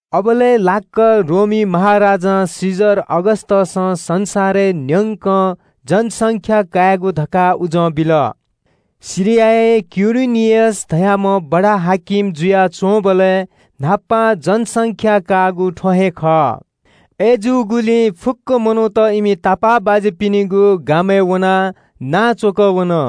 अबलय् लाक्‍क रोमी महाराजा कैसर अगस्‍टसं संसारय् न्‍यंक जनगणना का धकाः उजं बिल। सिरियाय् कुरेनियस धाःम्‍ह बडा-हाकिम जुयाच्‍वंबलय् न्‍हापां जनगणना काःगु थ्‍व हे खः। अय्‌जूगुलिं फुक्‍क मनूत इमि थथःगु गामय् व शहरय् वनाः नां च्‍वकः वन।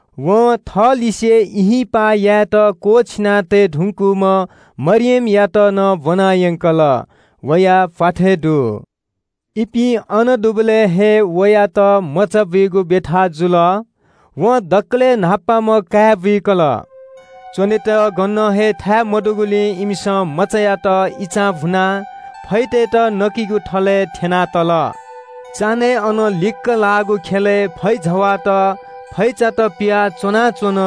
वं थःलिसे ब्‍याहा यायेत क्‍वःछिना तये धुंकूम्‍ह मरियमयात नं ब्‍वनायंकल। वया प्‍वाथय् दु। इपिं अन दुबलय् हे वयात मचाबुइगु ब्‍यथा जुल। वं दकलय् न्‍हापांम्‍ह काय् बुइकल। च्‍वनेत गनं हे थाय् मदुगुलिं इमिसं मचायात इचां भुनाः फैतय्‌त नकिगु थलय् थ्‍यनातल। चान्‍हय् अनं लिक्‍क लाःगु ख्‍यलय् फैजवाःत फैचात पिवाः च्‍वनाच्‍वन।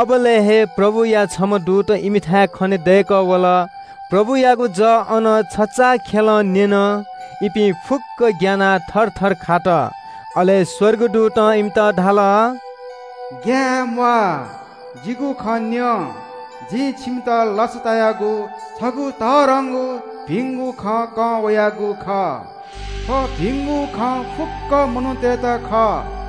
अबलय् हे प्रभुया छम्‍ह दूत इमिथाय् खनेदय्‌कः वल। प्रभुयागु जः अन छचाःखेलं न्‍यन। इपिं फुक्‍कं ग्‍यानाः थरथर खात। अले स्‍वर्गदूतं इमित धाल – “ग्‍याये म्‍वाः। जिगु खँ न्‍यँ, जि छिमित लसतायागु छगू तःधंगु भिंगु खँ कं वयागु खः। थ्‍व भिंगु खँ फुक्‍क मनूतय्‌त खः।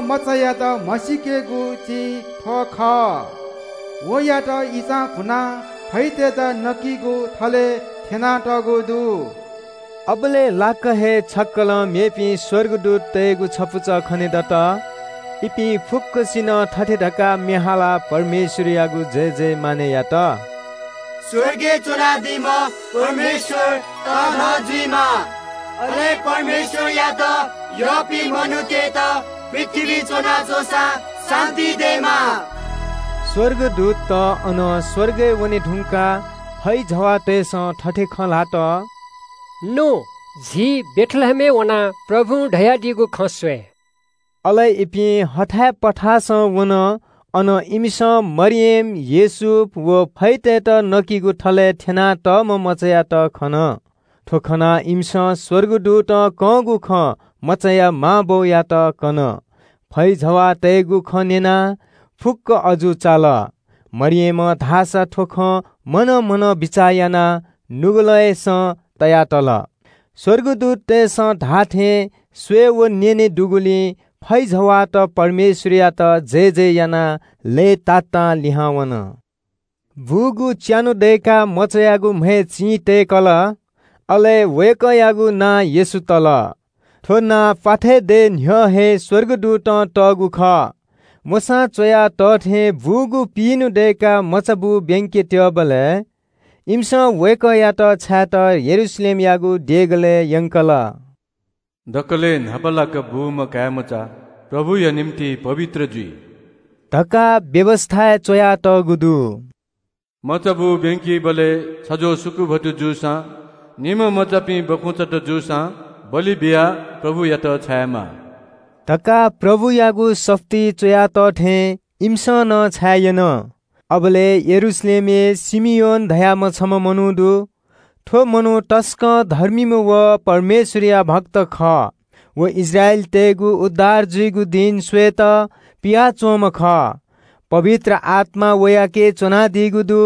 मचायात म्‍हसीकेगु चिं थ्‍व खः – वय्‌कःयात इचां भुनाः फैतय्‌त नकिगु थलय् थ्‍यनातःगु दु।” अबलय् लाक्‍क हे छक्‍कलं मेपिं स्‍वर्गदूततय्‌गु छपुचः खनेदत। इपिं फुक्‍कसिनं थथे धकाः म्‍ये हालाः परमेश्‍वरयागु जयजय यात – “स्‍वर्गय् च्‍वनादीम्‍ह परमेश्‍वर तःधं जुइमा। अले परमेश्‍वरयात यःपिं मनूतय्‌त पृथ्‍वीइ च्‍वनाच्‍वंसां शान्‍ति दयेमा।” स्‍वर्गदूतत अनं स्‍वर्गय् वने धुंकाः फैजवाःतय्‌सं थथे खँ ल्‍हात – “नु, झी बेथलेहेमय् वनाः प्रभुं धयादीगु खँ स्‍वये।” अले इपिं हथाय् पथासं वन। अन इमिसं मरियम, योसेफ व फैतय्‌त नकिगु थलय् थ्‍यनातःम्‍ह मचायात खन। थ्‍व खनाः इमिसं स्‍वर्गदूतं कंगु खँ मचाया मां बौयात कन। फैजवाःतय्‌गु खँ न्‍यनाः फुक्‍कं अजू चाल। मरियमं धाःसा थ्‍व खँ मनं मनं बिचाः यानाः नुगलय्‌सं तया तल। स्‍वर्गदूततय्‌सं धाःथें स्‍वये व न्‍यने दुगुलिं फैजवाःत परमेश्‍वरयात जयजय यानाः लय्‌तातां लिहां वन। बूगु च्‍यान्‍हु दय्‌काः मचायागु म्‍हय् चिं तय्‌कल। अले वय्‌कःयागु नां येशू तल। थ्‍व नां प्‍वाथय् दये न्‍ह्यः हे स्‍वर्गदूतं तःगु खः। मोशां च्‍वया तः थें बूगु पिइन्‍हु दय्‌काः मचाबू ब्‍यंके त्‍यःबलय् इमिसं वय्‌कःयात छायेत यरूशलेमयागु देगलय् यंकल। दकलय् न्‍हापालाक बूम्‍ह काय्‌मचा परमप्रभुया निंतिं पवित्र जुइ धकाः व्‍यवस्‍थाय् च्‍वयातःगु दु। मचाबू ब्‍यंकीबलय् छज्‍वः सुकुभत्तु जूसां निम्‍ह मचापिं बखुंचात जूसां बलि बियाः परमप्रभुयात छायेमाः धकाः परमप्रभुयागु सफुलिइ च्‍वया तः थें इमिसं नं छाये यन। अबलय् यरूशलेमय् शिमियोन धाःम्‍ह छम्‍ह मनू दु। थ्‍व मनू तसकं धर्मीम्‍ह व परमेश्‍वरया भक्त खः। व इस्राएलीतय्‌गु उद्धार जुइगु दिं स्‍वयेत पियाच्‍वंम्‍ह खः। पवित्र आत्‍मा वयाके च्‍वनादीगु दु।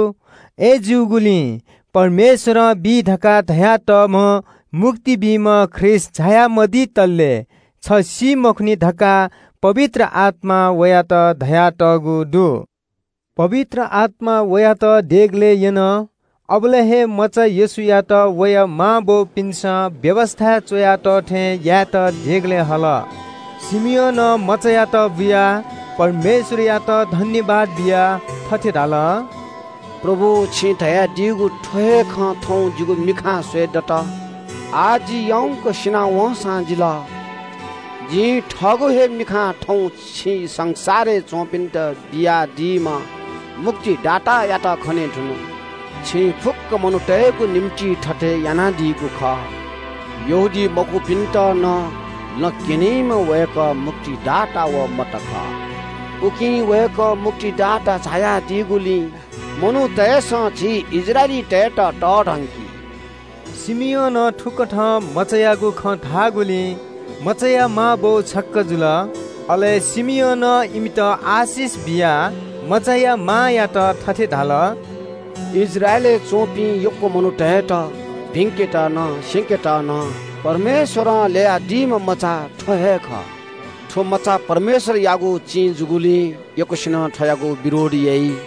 अय्‌जूगुलिं परमेश्‍वरं बी धकाः धयातःम्‍ह मुक्ति बीम्‍ह ख्रीष्‍ट झाया मदितले छ सी मखुनि धकाः पवित्र आत्‍मां वयात धयातःगु दु। पवित्र आत्‍मां वयात देगलय् यन। अबलय् हे मचा येशूयात वया मांबौपिन्‍सं व्‍यवस्‍थाय् च्‍वया तः थें यायेत देगलय् हल। शिमियोनं मचायात बुयाः परमेश्‍वरयात सुभाय् बियाः थथे धाल – “परमप्रभु, छिं धयादीगु थ्‍व हे खँ थौं जिगु मिखां स्‍वयेदत। आः जि याउँक सिना वंसां जिल। जिं थःगु हे मिखां थौं छिं संसारय् च्‍वंपिन्‍त बियादीम्‍ह मुक्तिदातायात खने धुन। छिं फुक्‍क मनूतय्‌गु निंतिं थथे यानादीगु खः। यहूदीमखुपिन्‍त नं लँ क्‍यनीम्‍ह वय्‌कः मुक्तिदाता व जः खः। उकिं वय्‌कः मुक्तिदाता झायादीगुलिं मनूतय्‌सं झी इस्राएलीतय्‌त तःधंकी।” शिमियोनं थुकथं मचायागु खँ धाःगुलिं मचाया मांबौ छक्‍क जुल। अले शिमियोनं इमित आशिष बियाः मचाया मांयात थथे धाल – “इस्राएलय् च्‍वंपिं यक्‍व मनूतय्‌त भिंकेत नं स्‍यंकेत नं परमेश्‍वरं ल्‍ययादीम्‍ह मचा थ्‍व हे खः। थ्‍व मचा परमेश्‍वरयागु चिं जूगुलिं यक्‍वसिनं थ्‍वयागु विरोध याइ।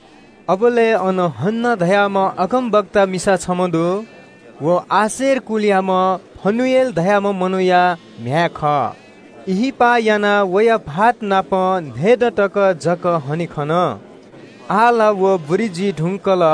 अबलय् अन हन्‍ना धाःम्‍ह अगमवादिनी मिसा छम्‍ह दु। व आशेर कुलयाम्‍ह फनुएल धाःम्‍ह मनूया म्‍ह्याय् खः। ब्‍याहा यानाः वया भाःतनाप न्‍हय्‌दँ तक जक ह्वने खन। आः ला व बुरी जुइ धुंकल।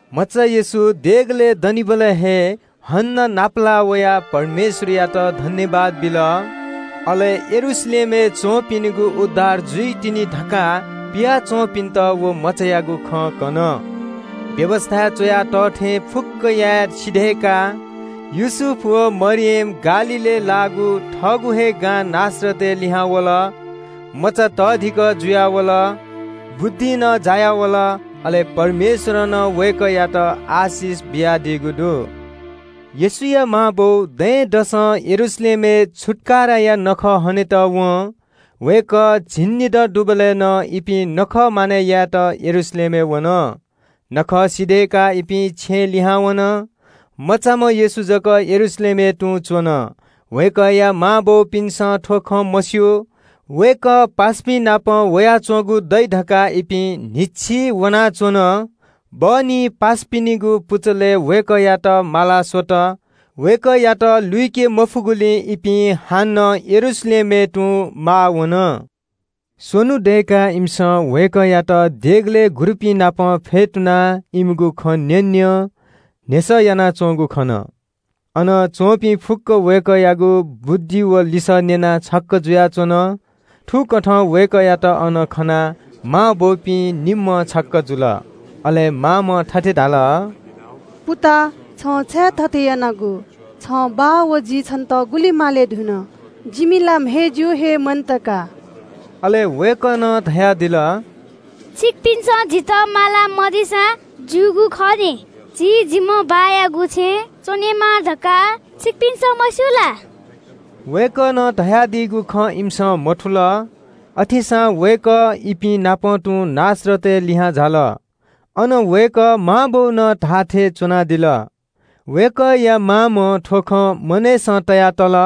मचा येशू देगलय् दनिबलय् हे हन्‍नां नापलाः वयाः परमेश्‍वरयात सुभाय् बिल। अले यरूशलेमय् च्‍वंपिनिगु उद्धार जुइतिनि धकाः पिया च्‍वंपिन्‍त व मचायागु खँ कन। व्‍यवस्‍थाय् च्‍वया तः थें फुक्‍कं याये सिधय्‌काः योसेफ व मरियम गालीलय् लाःगु थःगु हे गां नासरतय् लिहां वल। मचा तःधिकः जुयावल। बुद्धिं नं जायावल, अले परमेश्‍वरं नं वय्‌कःयात आशिष बियादीगु दु। येशूया मांबौ दँय्‌दसं यरूशलेमय् छुत्‍काराया नखः हनेत वं। वय्‌कः झिंनिदँ दुबलय् नं इपिं नखः मानय् यायेत यरूशलेमय् वन। नखः सिधय्‌काः इपिं छेँ लिहां वन। मचाम्‍ह येशू जक यरूशलेमय् तुं च्‍वन। वय्‌कःया मांबौपिन्‍सं थ्‍व खँ मस्‍यू। वय्‌कः पासापिंनापं वयाच्‍वंगु दइ धकाः इपिं न्‍हिच्‍छि वनाच्‍वन। बहनी थःथितिपिं व पासापिनिगु पुचलय् वय्‌कःयात माला स्‍वत। वय्‌कःयात लुइके मफुगुलिं इपिं हानं यरूशलेमय् तुं माः वन। स्‍वन्‍हु दय्‌काः इमिसं वय्‌कःयात देगलय् गुरुपिंनापं फ्‍यतुनाः इमिगु खँ न्‍यँन्‍यं, न्‍ह्यसः यानाच्‍वंगु खन। अन च्‍वंपिं फुक्‍क वय्‌कःयागु बुद्धि व लिसः न्‍यनाः छक्‍क जुयाच्‍वन। थुकथं वय्‌कःयात अन खनाः मांबौपिं निम्‍हं छक्‍क जुल। अले मांम्‍हं थथे धाल – “पुता, छं छाय् थथे यानागु? छं बाः व जिं छन्‍त गुलि माले धुन। जिमि ला म्‍हय् जिउ हे मन्‍त का।” अले वय्‌कलं धयादिल – “छिकपिन्‍सं जितः माला मदीसां ज्‍यूगु खः नि। जि जिम्‍ह बाःयागु छेँय् च्‍वनेमाः धकाः छिकपिन्‍सं मस्‍यू ला?” वय्‌कलं धयादीगु खँ इमिसं मथुल। अथेसां वय्‌कः इपिं नाप तुं नासरतय् लिहां झाल। अन वय्‌कः मांबौनं धाःथें च्‍वनादिल। वय्‌कःया मामं थ्‍व खँ मनय्‌सं तयातल।